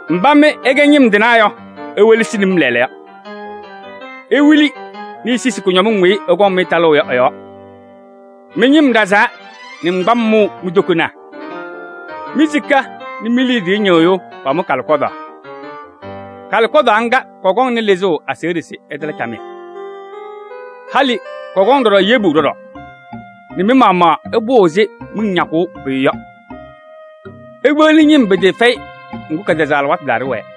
Mbá mɩ ɩkɛ ñɩm tɩnaa yɔ, iwelesini-m lɛɛlɛɛyɔ! Iwili nɛ isisi kʋñɔmɩŋ weyi ɩkɔŋ-mɩ talʋʋ yɔ ɩ-yɔɔ! Mɩ-ñɩm ɖazaa nɛ ŋgbam tɔɔ mi-tokonaa. Mi-sika nɛ mi-liidiye ñɩ́ɣ́yʋ́ʋ pamʋ kálɩkɔ́daɣ. Kálɩkɔ́daɣ ŋ́gá kɔkɔŋnɩ lɩzʋʋ aseɣɖe se ɩtala camɩyɛ. Halɩ kɔkɔŋ yebu ɖɔɖɔ nɛ mɩ-maɣmaɣ ɩpʋʋ ɛzɩ miŋ ñakʋʋ pʋyʋ yɔ. Ikpeɣli ñɩm pɩtɩɩfɛyɩ, ŋgʋ́, kɛtɛzaɣ alɩwaatʋ taa ɖɩwɛɛ.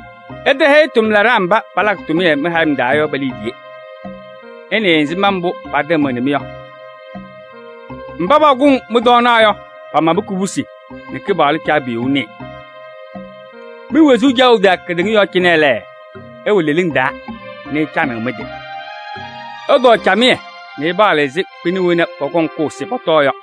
Ɩtɛhɛyɩ tʋmlaɖaa mbá palakɩ tʋmɩyɛ mɩ-hayɩm taa yɔ pe-liidiye. Ɩnɩɩ ɛzɩma mbʋ́ patɩmɩɣnɩ-mɩ yɔ! Mbá pakʋŋ mɩ-tɔɔnaɣ yɔ, pamabɩ kobusi nɛ Kɩpaɣlʋ Caabiyuu nɩɩ. Mi-wezuu caɣʋ taa kedeŋa yɔɔ cɩnɛ lɛ, ɩwɛ leleŋ taa nɛ ɩcanɩɣ mɩ-tɩ. Ɩtɔɔ camɩyɛ nɛ ɩpaɣlɩ ɛzɩ kpɩna wena pɔkɔŋ kʋʋ se pɔtɔɔ yɔ.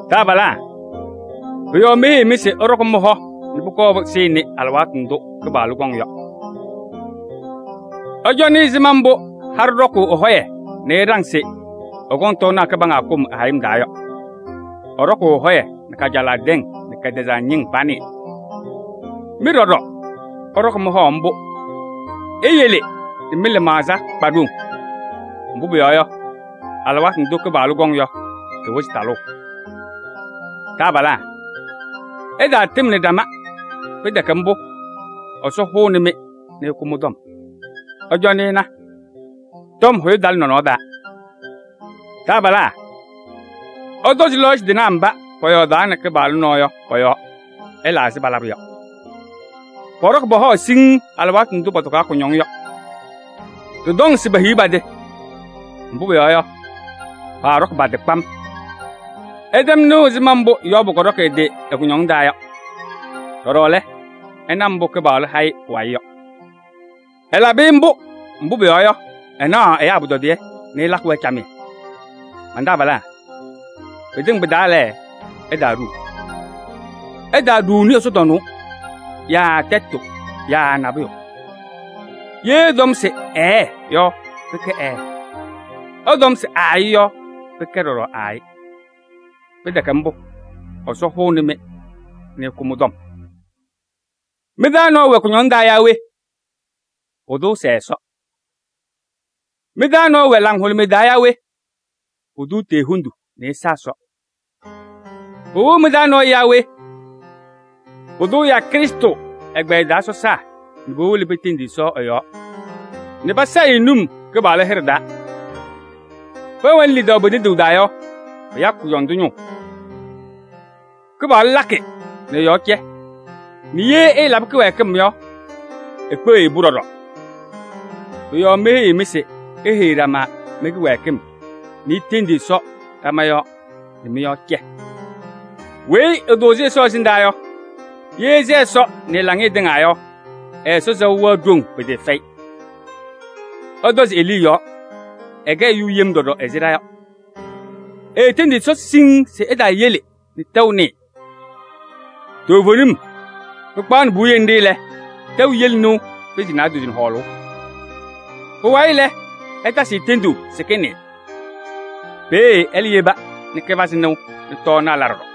Taabalaa! Pʋ-yɔɔ meheyiɣ-mɩ se ɩɖɔkɩ mɩ-hɔ nɛ pʋkɔɔ pɩsɩɩnɩ alɩwaatʋ ndʋ́ Kɩpaɣlʋ kɔŋ yɔ. Ɩcɔnɩ ɛzɩma mbʋ́ haɖʋ ɖɔkʋʋ ɛ-hɔyɛ nɛ ɛɖaŋ se ɛkɔŋ tɔɔnaɣ kɩbaŋga kʋm ɛ-hayɩm taa yɔ: ɛɖɔkʋʋ ɛ-hɔyɛ nɛ kajalaɣ tɛŋ nɛ kɛtɛzaɣ ñɩŋ panɩɩ. Mɩ ɖɔɖɔ, ɩɖɔkɩ mɩ-hɔ ḿbʋ́, iyele nɛ mɩ-lɩmaɣza kpa ɖoŋ. Mbʋ́ pʋyɔɔ yɔ, alɩwaatʋ ndʋ́ Kɩpaɣlʋ kɔŋ yɔ, tɩwɩzɩ talʋʋ. Taabalaa! Ɩtaatɩmnɩ ɖama, pɩtɛkɛ ḿbʋ́, Ɛsɔ hʋʋnɩ-mɩ nɛ ɛkʋ mɩ-tɔm. Ɩcɔnɩ ɩna: tɔm hʋyʋ talɩ nɔnɔɔ taa! Taabalaa! Ɩtɔzɩ náyaa mbá pɔyɔɔdaɣnɩ Kɩpaɣlʋ nɔɔ yɔ pɔ-yɔɔ, ɩla ɛzɩ palabʋ yɔ. Pɔɖɔkɩ pɔ-hɔ siŋŋ alɩwaatʋ ndʋ́ pɔtɔkaɣ kʋñɔŋ yɔ. Đɩtɔŋ se pehiɣ pa-tɩ! Mbʋ́ pʋyɔɔ yɔ, paaɖɔkɩ pa-tɩ kpam. Ɩtɛm nɩʋ ɛzɩma mbʋ́ Yɔɔbʋ kɔɖɔkɩ ɛ-tɩ ɛ-kʋñɔŋ taa yɔ. Đɔɖɔ lɛ, ɩna mbʋ́ Kɩpaɣlʋ ha-ɩ pʋwayɩ yɔ. Ɛlabɩ-ɩ ḿbʋ́, mbʋ́ pʋyɔɔ yɔ, ɛnaɣ ɛyáa pʋtɔdɩyɛ nɛ ɛlakɩ-wɛ camɩyɛ. Man-taabalaa! Pɩtɩŋa pɩ-taa lɛ, ɩtaaɖuu: ɩtaaɖuuni ɛsɔdaa yaa tɛtʋ yaa nabʋyʋ. Yee ɩtɔm se: “Ɛɛ” yɔ, pɩkɛ “Ɛɛ.” Ɩtɔm se: “Aayɩ” yɔ, pɩkɛ ɖɔɖɔ “Aayɩ.” Pɩtɛkɛ ḿbʋ́, Ɛsɔ hʋʋnɩ-mɩ nɛ ɛkʋ mɩ-tɔm. Mɩ-taa nɔɔyʋ wɛ kʋñɔŋ taa yaa we? Pʋdʋ ɛsɛɛ Ɛsɔ. Mɩ-taa nɔɔyʋ wɛ laŋhʋlʋmɩyɛ taa yaa we? Pʋdʋ etee hendu nɛ ɛsa Ɛsɔ. Pɩwɩɣ mɩ-taa nɔɔyʋ yaa we? Pʋdʋ ɛ́yáa Krɩstʋ ŋgbɛyɛ taa sɔsaa nɛ powolo petendi Ɛsɔ ɛ-yɔɔ nɛ pasayɩ-ɩ num Kɩpaɣlʋ hɩɖɛ taa. Pɛwɛnɩ lidaʋ pe-tenduu taa yɔ, pɩyakɩ kʋdɔndʋ ñʋʋ: Kɩpaɣlʋ lakɩ nɛ ɛ-yɔɔ cɛ nɛ yee ɛɛlaba kɩwɛɛkɩm yɔ, ekpeɣ-i-pʋ ɖɔɖɔ. Pʋ-yɔɔ meheyiɣ-mɩ se iheyi ɖama mɩ-kɩwɛɛkɩm nɛ itendi Ɛsɔ ɖama yɔɔ nɛ mɩ-yɔɔ cɛ. Weyi ɛtʋʋzɩ Ɛsɔ ɛsɩndaa yɔ, yee ɛsɛ Ɛsɔ nɛ ɛ-laŋɩyɛ tɩŋa yɔ, ɛ-Ɛsɔ sɛʋ wɛɣ ɖoŋ pɩtɩɩfɛyɩ. Ɩtɔzɩ Elii yɔɔ, ɛkɛ ɛyʋ yem ɖɔɖɔ ɛzɩ ɖa yɔ: eetendi Ɛsɔ siŋŋ se ɛtaayele nɛ tɛʋ nɩɩ. Toovenim, pɩkpaɣnɩ puwiye ńɖɩ́ lɛ, tɛʋ yele nɩʋ pɩnzɩ naadozo nɛ hɔɔlʋʋ. Pʋwayɩ lɛ, ɛtasɩ-ɩ tenduu se kɩnɩɩ. Peeɖe ɛ́lɛ́ yeba nɛ kɩpazɩ nɩʋ nɛ tɔɔnaɣ la ɖɔɖɔ.